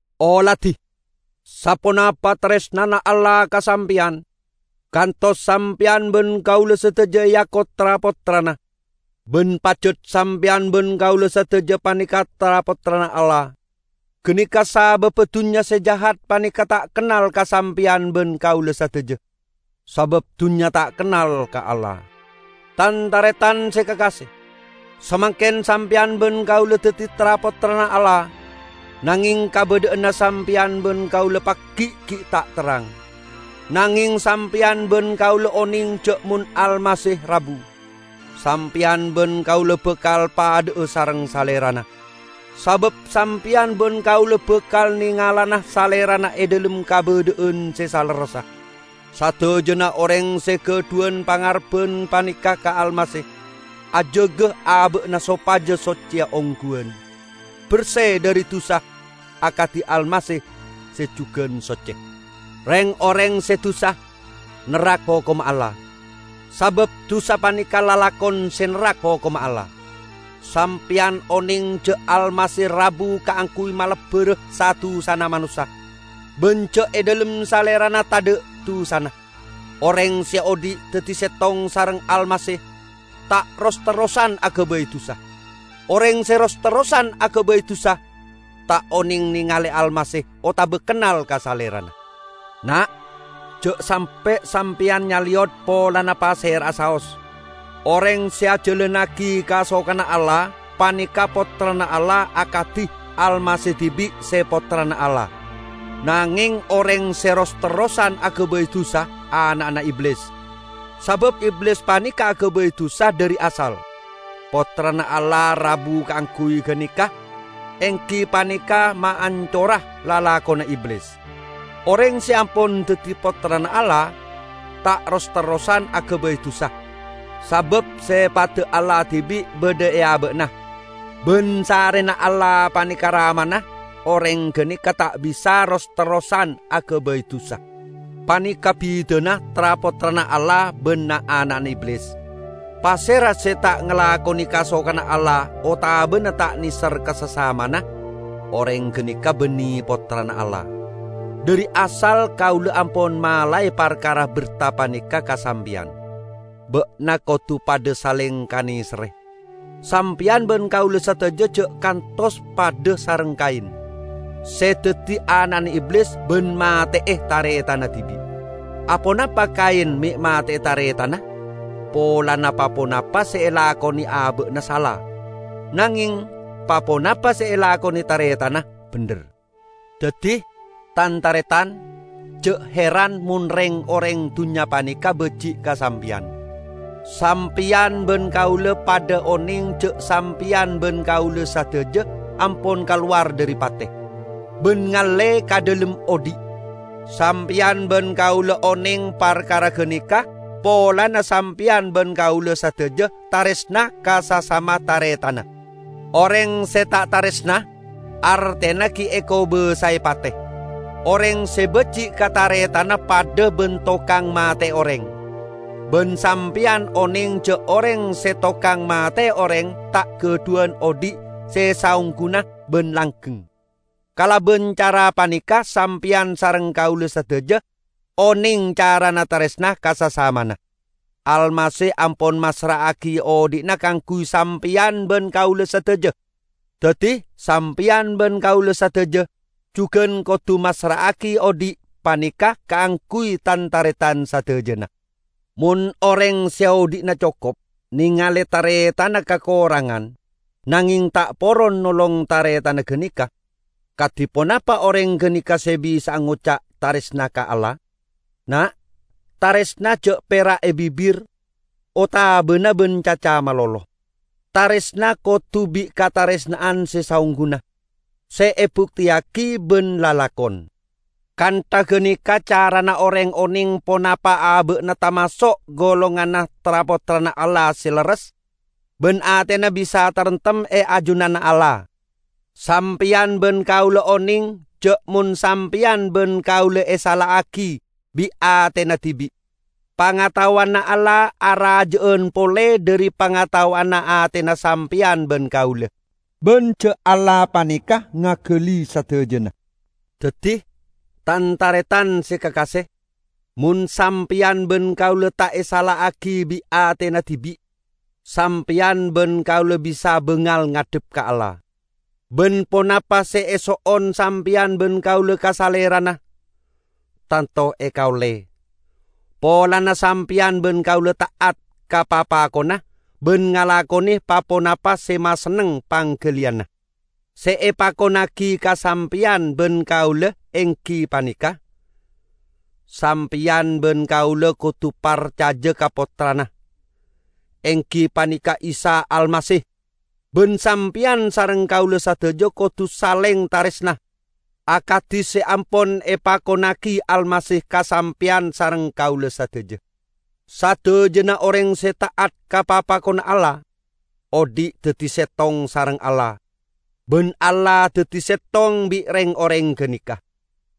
Oladi, saponapa taresnana Allah ka sampeyan, kantos sampeyan ban kaula sadaja eako tra-pottrana. Ban pajat sampeyan ban kaula sadaja paneka tra-pottrana Allah. Ganeka sababba dunnya se jahat paneka ta' kennal ka sampeyan ban kaula sadaja, sabab dunnya ta' kennal ka Allah. Tan-taretan se kakase! Samangken sampeyan ban kaula daddi tra-pottrana Allah, nangeng kabadha'anna sampeyan ban kaula pagi' gi' ta' terrang. Nangeng sampeyan ban kaula oneng ja' mon Almasih rabu, sampeyan ban kaula bakal padha'a sareng Salerana, sabab sampeyan ban kaula bakal nengalana Salerana e dhalem kabadha'an se salerressa. Sadajana oreng se gadhuwan pangarebban paneka ka Almasih, ajaga aba'na sopaja socce ongguwan, berse dhari dusa akadi Almasih se jugan socce. Reng-oreng se dusa, nerrak hokomma Allah; sabab dusa paneka lalakon se nerrak hokomma Allah. Sampeyan oneng ja' Almasih rabu kaangguy malebbara sa-dusana manossa, ban ja' e dhalem Salerana tadha' dusana. Oreng se odhi' daddi settong sareng Almasih, ta' ros-terrosan agabay dusa. Oreng se ros-terrosan agabay dusa, ta' oneng nengale Almasih otaba kennal ka Salerana. Na', ja' sampe' sampeyan nyaleyot polana pasera'a saos. Oreng se ajalannagi kasokanna Allah paneka pottrana Allah akadi Almasih dibi' se Pottrana Allah. Nangeng oreng se ros-terrosan agabay dusa ana'na Iblis, sabab Iblis paneka agabay dusa dhari asal. Pottrana Allah rabu kaangguy ganeka, enggi paneka maancora lalakonna Iblis. Oreng se ampon daddi Pottrana Allah, ta' ros-terrosan agabay dusa, sabab sepadda Allah dibi' badha e aba'na. Ban sarrena Allah paneka Ramana, oreng ganeka ta' bisa ros-terrosan agabay dusa. Paneka' bidana tra-pottrana Allah ban na'-ana'na Iblis: pasera se ta' ngalakone kasokanna Allah otabana ta' neser ka sasamana, oreng ganeka banne pottrana Allah. Dhari asal kaula ampon malae parkara berta paneka ka sampeyan: Ba'na kodu padha saleng kaneserre. Sampeyan ban kaula sadaja ja' kantos padha sareng Kain, se daddi ana'na Iblis ban mate'e taretanna dibi'. Aponapa Kain me' mate'e taretanna? Polana pa-ponapa se elakone aba'na sala, nangeng pa-ponapa se elakone taretanna bendher. Daddi, tan-taretan, ja' heran mon reng-oreng dunnya paneka baji' ka sampeyan. Sampeyan ban kaula padha oneng ja' sampeyan ban kaula sadaja ampon kalowar dhari pate, ban ngalle ka dhalem odhi'. Sampeyan ban kaula oneng parkara ganeka polana sampeyan ban kaula sadaja taresna ka sasama taretanna. Oreng se ta' taresna, artena gi' ekobasae pate. Oreng se baji' ka taretanna padha ban tokang mate'e oreng, ban sampeyan oneng ja' oreng se tokang mate'e oreng ta' gadhuwan odhi' se saongguna ban langgeng. Kalaban cara paneka sampeyan sareng kaula sadaja oneng carana taresna ka sasamana: Almasih ampon massra'agi odhi'na kaangguy sampeyan ban kaula sadaja. Daddi, sampeyan ban kaula sadaja jugan kodu massra'agi odhi' paneka kaangguy tan-taretan sadajana! Mon oreng se odhi'na cokop nengale taretanna kakorangan nangeng ta' poron nolong taretanna ganeka, kadi ponapa oreng ganeka se bisa'a ngoca' taresna ka Allah? Na', taresna ja' pera' e bibir otabana ban caca malolo; taresna kodu bi' kataresna'an se saongguna, se ebukteyagi ban lalakon. Kantha ganeka carana oreng oneng ponapa aba'na tamaso' golonganna tra-pottrana Allah se lerres, ban atena bisa taremtem e ajunanna Allah. Sampeyan ban kaula oneng ja' mon sampeyan ban kaula esala'agi bi' atena dibi', pangataowanna Allah araja'an pole dhari pangataowanna atena sampeyan ban kaula, ban ja' Allah paneka ngagali sadajana. Daddi, tan-taretan se kakase, mon sampeyan ban kaula ta' esala'agi bi' atena dibi', sampeyan ban kaula bisa bangal ngadhep ka Allah. Ban ponapa se eso'on sampeyan ban kaula ka Salerana, tanto ekaolle, polana sampeyan ban kaula ta'at ka papakonna ban ngalakone pa-ponapa se masenneng panggaliyanna. Se epakonnagi ka sampeyan ban kaula enggi paneka: Sampeyan ban kaula kodu parcaja ka Pottrana, enggi paneka Isa Almasih, ban sampeyan sareng kaula sadaja kodu saleng taresna, akadi se ampon epakonnagi Almasih ka sampeyan sareng kaula sadaja. Sadajana oreng se ta'at ka papakonna Allah, odhi' daddi settong sareng Allah, ban Allah daddi settong bi' reng-oreng ganeka.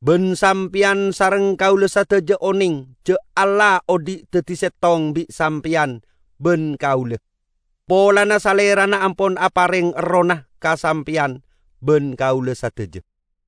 Ban sampeyan sareng kaula sadaja oneng ja' Allah odhi' daddi settong bi' sampeyan ban kaula, polana Salerana ampon apareng Errohna ka sampeyan ban kaula sadaja.